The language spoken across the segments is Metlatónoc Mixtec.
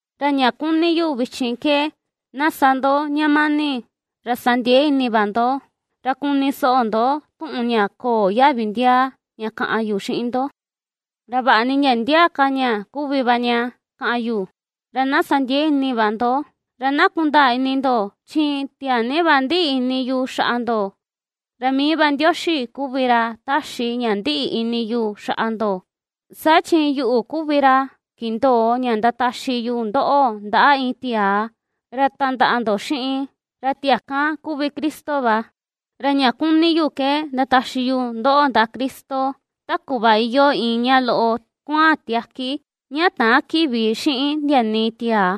Ra ña kuni yu vichin ke na sa ndo ña mani, ra sandiee ini va ndo, ra kuni soꞌo ndo tuꞌun ña köo yaꞌvi ndiaa ña kaꞌan yu xiꞌin ndo, ra vaꞌa ni ndia ndia ka ña kuvi va ña kaꞌan yu, ra na sa ndiee ini va ndo. Ra na kundaa ini ndo, chi tiaa ni va ndiꞌi ini yu xaꞌa ndo, ra mii va Ndioxi kuvi ra ^taxi ña ndiꞌi ini yu xaꞌa ndo; saa chi yuꞌu kuvi ra kindoo ña ndataxi yu ndoꞌo ndaꞌa iin tiaa ra tandaꞌa ndo xiꞌin, ra tiaa kan kuvi Cristo va, ra ña kuni yu ke ndataxi yu ndoꞌo ndaꞌa Cristo, ta kuꞌva iyoo iin ña loꞌo kuaan tiaki, ña täan kiꞌvi xiꞌin ndia nii tiaa.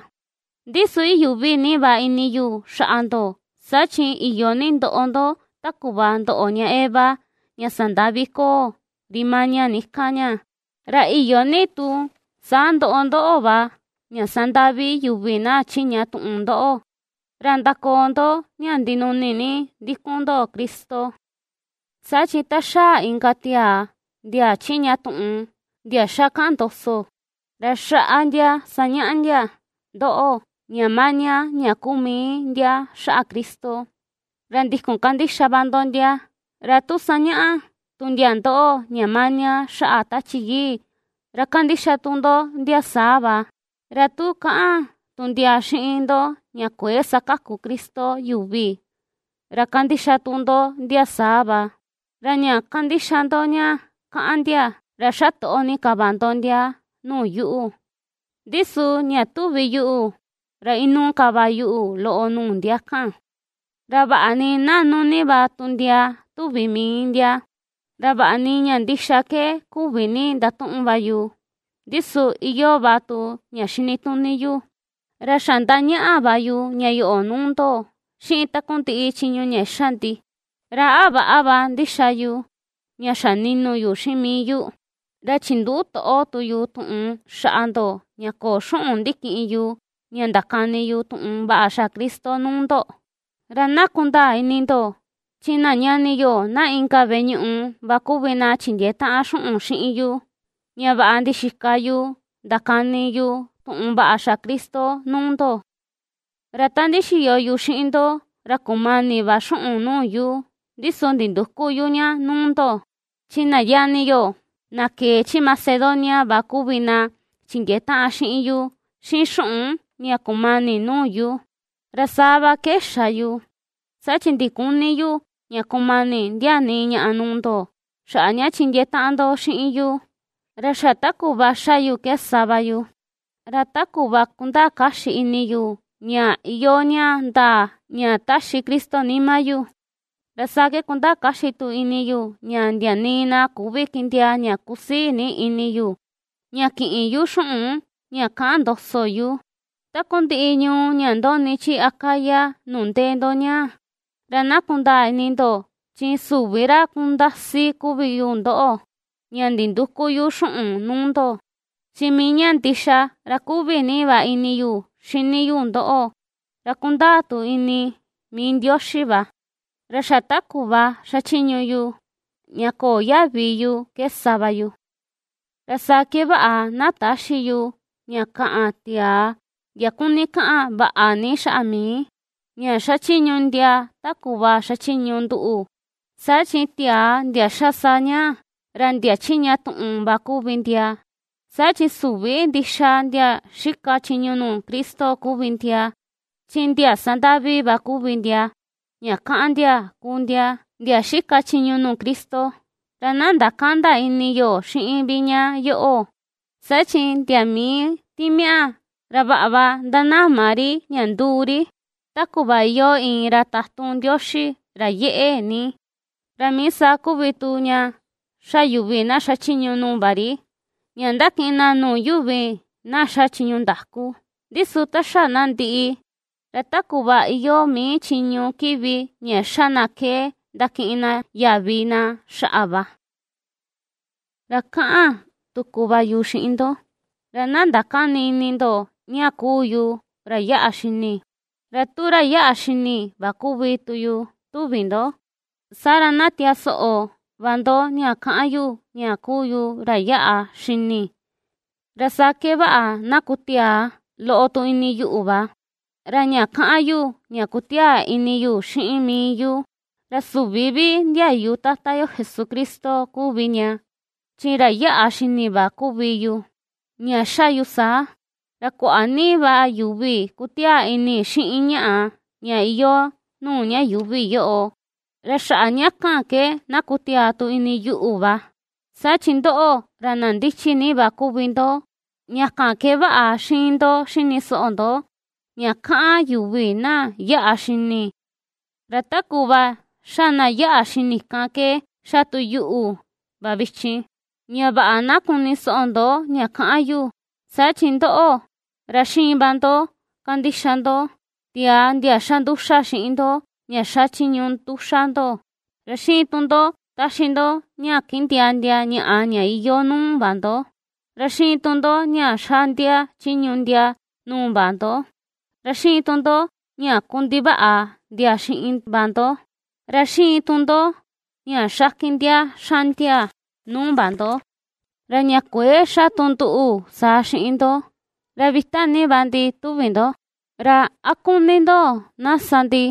Ndi su iyuꞌvi ni va ini yu xaꞌa ndo, saa chi iyo ni ndoꞌo ndo, ta kuꞌva ndoꞌo ña Eva, ña sandaꞌvi koo, ri maña ni kan ña. Ra iyo ni tu saa ndoꞌo ndóꞌo̱ va, ña sandaꞌvi yuvi na chiꞌña tuꞌun ndoꞌo, ra ndakoo ndo ña ndinuni ni ndikun ndo Cristo. Saa chi ta xaa inka tiaa, ndia chiꞌña tuꞌun, ndia ^xa kaꞌan ndoso, ra xaꞌa ndia sañaꞌa ndia ndoꞌo, ña maña ña kuu mii ndia xaꞌa Cristo, ra ndikun kandixa va ndo ndia; ra tu sañaꞌa tu ndia ndoꞌo ña maña xaꞌa Tachi Yii, ra kandixa tu ndo ndia saa va; ra tu kaꞌan tu ndia xiꞌin ndo ña kuëe sakaku Cristo yuvi, ra kandixa tu ndo ndia saa va. Ra ña ^kandixa ndo ña ^kaꞌan ndia, ra xatoꞌo ni ka va ndo ndia nuu yuꞌu. Ndi su ña tuvi yuꞌu, ra inuu ka va yuꞌu loꞌo nuu ndia kan, ra vaꞌa ni naꞌnu ni va tu ndia tuvi mii ndia. Ra vaꞌa ni ña ndixa ke küvi ni ndatuꞌun va yu, ndi su iyoo va tu ña xinituni yu; ra xa ^ndañaꞌa va yu ña yoꞌo nuu ndo, xiꞌin takundiꞌi chiñu ña ^xa ndi. ¿Ra a väꞌa va ndixa yu, ña xa ninu yu xiꞌin mii yu, ra chinduꞌu toꞌo tu yu tuꞌun xaꞌa ndoꞌo ña köo xuꞌun ndikiꞌin yu ña ndakani yu tuꞌun vaꞌa xaꞌa Cristo nuu ndo? Ra na kundaa ini ndo, chi na ñani yo na inka veꞌe ñuꞌu va kuvi na chindiee taꞌan xuꞌun xiꞌin yu, ña vaꞌa ndixika yu ndakani yu tuꞌun vaꞌa xaꞌa Cristo nuu ndo. Ra ta ndixiyo yu xiꞌin ndo, ra kumani va xuꞌun nuu yu, ndi su nindüku yu ña nuu ndo; chi na ñani yo, na kee chi Macedonia va kuvi na chindiee taꞌan xiꞌin yu xiꞌin xuꞌun ña kumani nuu yu. Ra saa va ke xa yu, saa chi ndiküni yu ña kumani ndia nii ñaꞌa nuu ndo, xaꞌa ña chindiee taꞌan ndo xiꞌin yu. Ra xa ta kuꞌva ^xa yu ke sa va yu. Ra ta kuꞌva kundaa kaxi ini yu ña iyoo ña ndaa ña ^taxi Cristo nima yu, ra saa ke kundaa kaxi tu ini yu ña ndia nii na küvi kindiaa ña kusii ni ini yu, ña kïꞌin yu xuꞌun ña kaꞌan ndoso yu, takundiꞌi ñuu ña ndoꞌni chi Acaya nuu ndee ndo ñaa. Ra na kundaa ini ndo, chi süvi ra kundasi kuvi yu ndoꞌo, ña nindüku yu xuꞌun nuu ndo, chi mii ña ndixa ra ^kuꞌvi ni va ini yu xini yu ndoꞌo, ra kundaa tu ini mii Ndioxi va. Ra xa ta kuꞌva xachiñu yu, ña köo yaꞌvi yu ke sa va yu, ra saa ke vaꞌa, na täxi yu ña kaꞌan tiaa, ndia kuni kaꞌan vaꞌa ni xaꞌa mii, ña ^xachiñu ndia ta kuꞌva ^xachiñu nduꞌu. Saa chi tiaa ndia ^xa saa ñaa, ra ndia chiꞌña tuꞌun va kuvi ndia, saa chi süvi ndixa ndia xika chiñu nuu Cristo kuvi ndia, chi ndia sandaꞌvi va kuvi ndia, ña ^kaꞌan ndia kuu ndia, ndia xika chiñu nuu Cristo. Ra na ndakända ini yo xiꞌin vi ña yoꞌo, saa chi ndia mii timiaꞌa, ra vaꞌa va ^ndanama ri ña nduu ri, ta kuꞌva iyoo iin ra tatun Ndioxi ra yeꞌe ni. Ra mii saa kuvi tu ña ^xa yuvi na xachiñu nuu va ri, ña ndakiꞌin na nuu yuvi na ^xa chiñu ndaku. Ndi su ta xa na ndiꞌi, ra ta kuꞌva iyoo mii chiñu kiꞌvi ña ^xa na ke ndakiꞌin na yaꞌvi na xaꞌa va. Ra kaꞌan tuku va yu xiꞌin ndo, ra na ndakäni ini ndo ña kuu yu ra yaꞌa xini; ra tu ra yaꞌa xini va kuvi tu yu tuvi ndo, saa ra, na tiaa soꞌo va ndo ña kaꞌan yu ña kuu yu ra yaꞌa xini, ra saa ke vaꞌa na kutiaa loꞌo tu ini yuꞌu va. Ra ña kaꞌan yu ña ^kutiaa ini yu xiꞌin mii yu, ra süvi vi ndiayu Tata yo Jesucristo kuvi ña, chi ra yaꞌa xini va kuvi yu ña ^xa yu saa. Ra kuaꞌa ni va yuvi kutiaa ini xiꞌin ñaꞌa, ña iyoo nuu ña yuuvi yoꞌo, ra xaꞌa ña kan ke na kutiaa tu ini yuꞌu va. Saa chi ndoꞌo, ra na ndichi ni va kuvi ndo, ña kan ke vaꞌa xiin ndo xini soꞌo ndo, ña kaꞌan yuvi na yaꞌa xini, ra ta kuꞌva ^xa na yaꞌa xini kan ke ^xa tu yuꞌu va vichin, ña vaꞌa na kuni soꞌo ndo ña kaꞌan yu. Saa chi ndoꞌo, ra ^xiin va ndo kandixa ndo, tiaa ndia ^xa nduxa xiꞌin ndo ña xachiñu nduxa ndo, ra ^xiin tu ndo taxi ndo ña kindiaa ndia ñaꞌa ña iyoo nuu va ndo, ra ^xiin tu ndo ña xaꞌndia chiñu ndia nuu va ndo, ra ^xiin tu ndo ña kundivaꞌa ndia xiꞌin va ndo, ra ^xiin tu ndo ña xakin ndia xaꞌndia nuu va ndo. Ra ña kuëe ^xa tu nduꞌu saa xiꞌin ndo, ra vita ni va ndi tuvi ndo, ¿ra a kuni ndo na sa ndi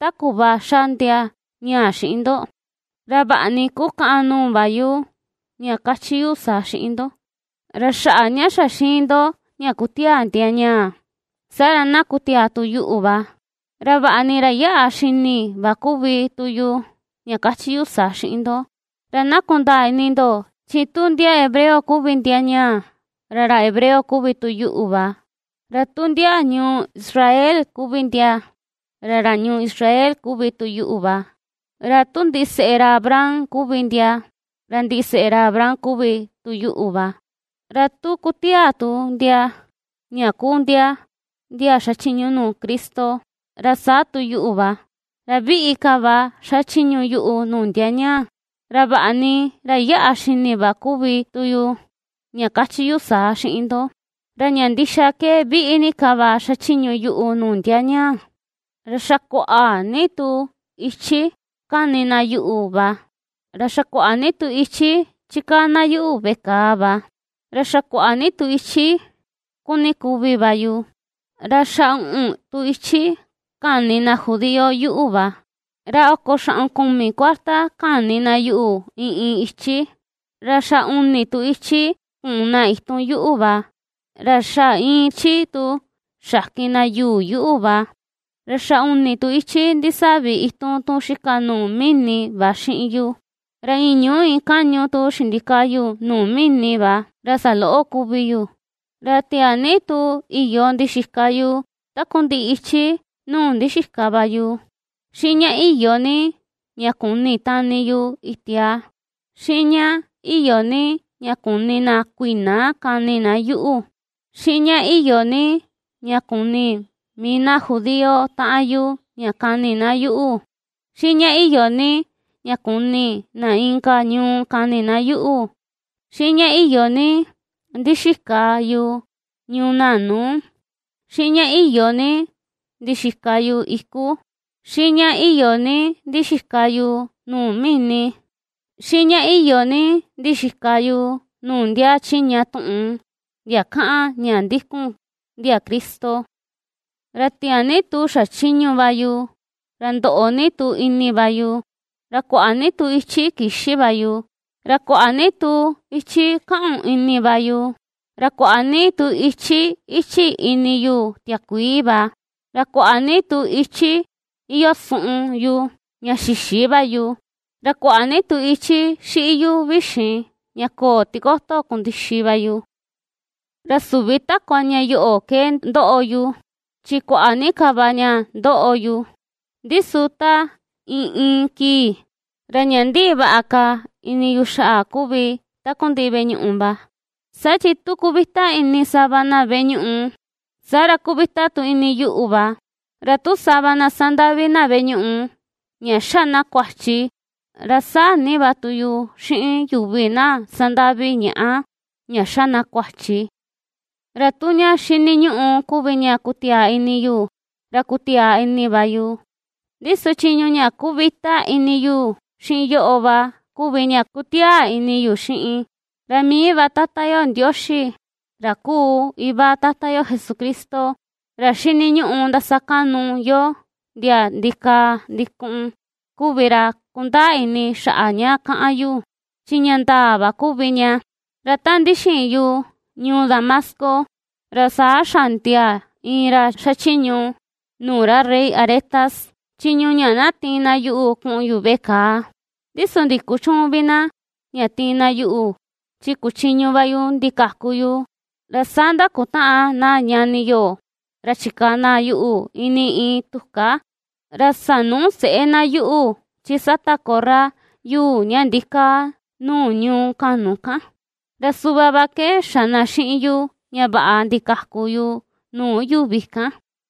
ta kuꞌva ^xa ndia ñaa xiꞌin ndo? Ra vaꞌa ni ^kukaꞌan nuu va yu ña ^kachi yu saa xiꞌin ndo. Ra xaꞌa ña xa ^xiin ndo ña ^kutiaa ndia ñaa, saa ra na kutiaa tu yuꞌu va, ra vaꞌa ni ra ^yaꞌa xini va kuvi tu yu ña kachi yu saa xiꞌin ndo. Ra na kundaa ini ndo, chi tu ndia hebreo kuvi ndia ñaa, ra ra hebreo kuvi tu yuꞌu va; ra tu ndia ñuu Israel kuvi ndia, ra ra ñuu Israel kuvi tu yuꞌu va; ra tu ndiseꞌe ra Abraham kuvi ndia, ra ndiseꞌe ra Abraham kuvi tu yuꞌu va; ra tu kutiaa tu ndia ña kuu ndia ndia xachiñu nuu Cristo, ra saa tu yuꞌu va; ra viꞌi ka va xachiñu yuꞌu nuu ndia ñaa. Ra vaꞌa ni ra yaꞌa xini va kuvi tu yu ña kachi yu saa xiꞌin ndo, ra ña ndixa ke viꞌi ni ka va xachiñu yuꞌu nuu ndia ñaa. Ra xa kuaꞌa ni tu ichi ^kani na yuꞌu va, ra xa kuaꞌa ni tu ichi chikaa na yuꞌu veꞌe kàà va, ra xa kuaꞌa ni tu ichi kuni kuvi va yu. Ra xa uꞌun tu ichi kani na judío yuꞌu va; ra oko xaꞌun kumi kuarta kani na yuꞌu, iin iin ichi; ra xa uni tu ichi kuun na itun yuꞌu va; ra xa iin ichi tu xakin na yuu yuꞌu va; ra xa uni tu ichi ndisaꞌvi itun tun xika nuu mini va xiꞌin yu; ra iin ñuu iin kaꞌñu tu xindikaa yu nuu mini va, ra saloꞌo kuvi yu. Ra tiaa ni tu iyo ndixika yu takundiꞌi ichi nuu ndixika va yu; xiꞌin ña iyo ni ña kuni tani yu itia; xiꞌin ña iyo ni ña kuni na kuiꞌna kaꞌni na yuꞌu; xiꞌin ña iyo ni ña kuni mii na judío taꞌan yu ña kaꞌni na yuꞌu; xiꞌin ña iyo ni ña kuni na inka ñuu kaꞌni na yuꞌu. Xiꞌin ña iyo ni ndixika yu ñuu naꞌnu; xiꞌin ña iyo ni ndixika yu iku; xiꞌin ña iyo ni ndixika yu nuu mini; xiꞌin ña iyo ni ndixika yu nuu ndia chiꞌña tuꞌun, ndia kaꞌan ña ndikun ndia Cristo. Ra tiaa ni tu xachiñu va yu; ra ndoꞌo ni tu ini va yu; ra kuaꞌa ni tu ichi kïxi va yu; ra kuaꞌa ni tu ichi kaꞌun ini va yu, ra kuaꞌa ni tu ichí íchi̱ ini yu tiakuii va; ra kuaꞌa ni tu ichi iyoo suꞌun yu, ña xïxi va yu; ra kuaꞌa ni tu ichi xiꞌi yu vixin, ña köo tikoto kundixi va yu. Ra süvi takua ña yoꞌo ke ^ndoꞌo yu, chi kuaꞌa ni ka va ña ^ndoꞌo yu, ndi su ta iin iin kii, ra ña ^ndiꞌi vaꞌa ka ini yu xaꞌa kuvi takundiꞌi veꞌe ñuꞌu va. Saa chi tu kuvita ini sava na veꞌe ñuꞌu, saa ra kuvita tu ini yuꞌu va. Ra tu sava na sandaꞌvi na veꞌe ñuꞌu, ña ^xa na kuachi, ra ^saa ni va tu yu xiꞌin yuvi na sandaꞌvi ñaꞌa, ña ^xa na kuachi. Ra tu ña xiniñuꞌu kuvi ña kutiaa ini yu, ra kutiaa ini va yu, ndi su chiñu ña ^kuvita ini yu xiꞌin yoꞌo va kuvi ña kutiaa ini yu xiꞌin. Ra mii va Tata yo Ndioxi, ra kuu Iva Tata yo Jesucristo, ra ^xiniñuꞌu ndasakaꞌnu yo ndia ndikaa ndikuꞌun, kuvi ra kundaa ini xaꞌa ña kaꞌan yu, chi ña ndaa va kuvi ña. Ra ta ndixiin yu ñuu Damasco, ra saa xaꞌndia iin ra xachiñu nuu ra rey Aretas, chiñu ña na tiin na yuꞌu kuꞌun yu veꞌe kàà; ndi su ndikuchüun vi na, ña tiin na yuꞌu, chi kuchiñu va yu ndikaku yu, ra saa ndakutaꞌan na ñani yo, ra chikaa na yuꞌu ini iin tuká, ra sanuu seꞌé na yuꞌu chi sata korra yuu ña ndikaa nuu ñuu kaꞌnu kan, ra suꞌva va ke xa na xiꞌin yu ña vaꞌa ndikaku yu nuu yuvi kan.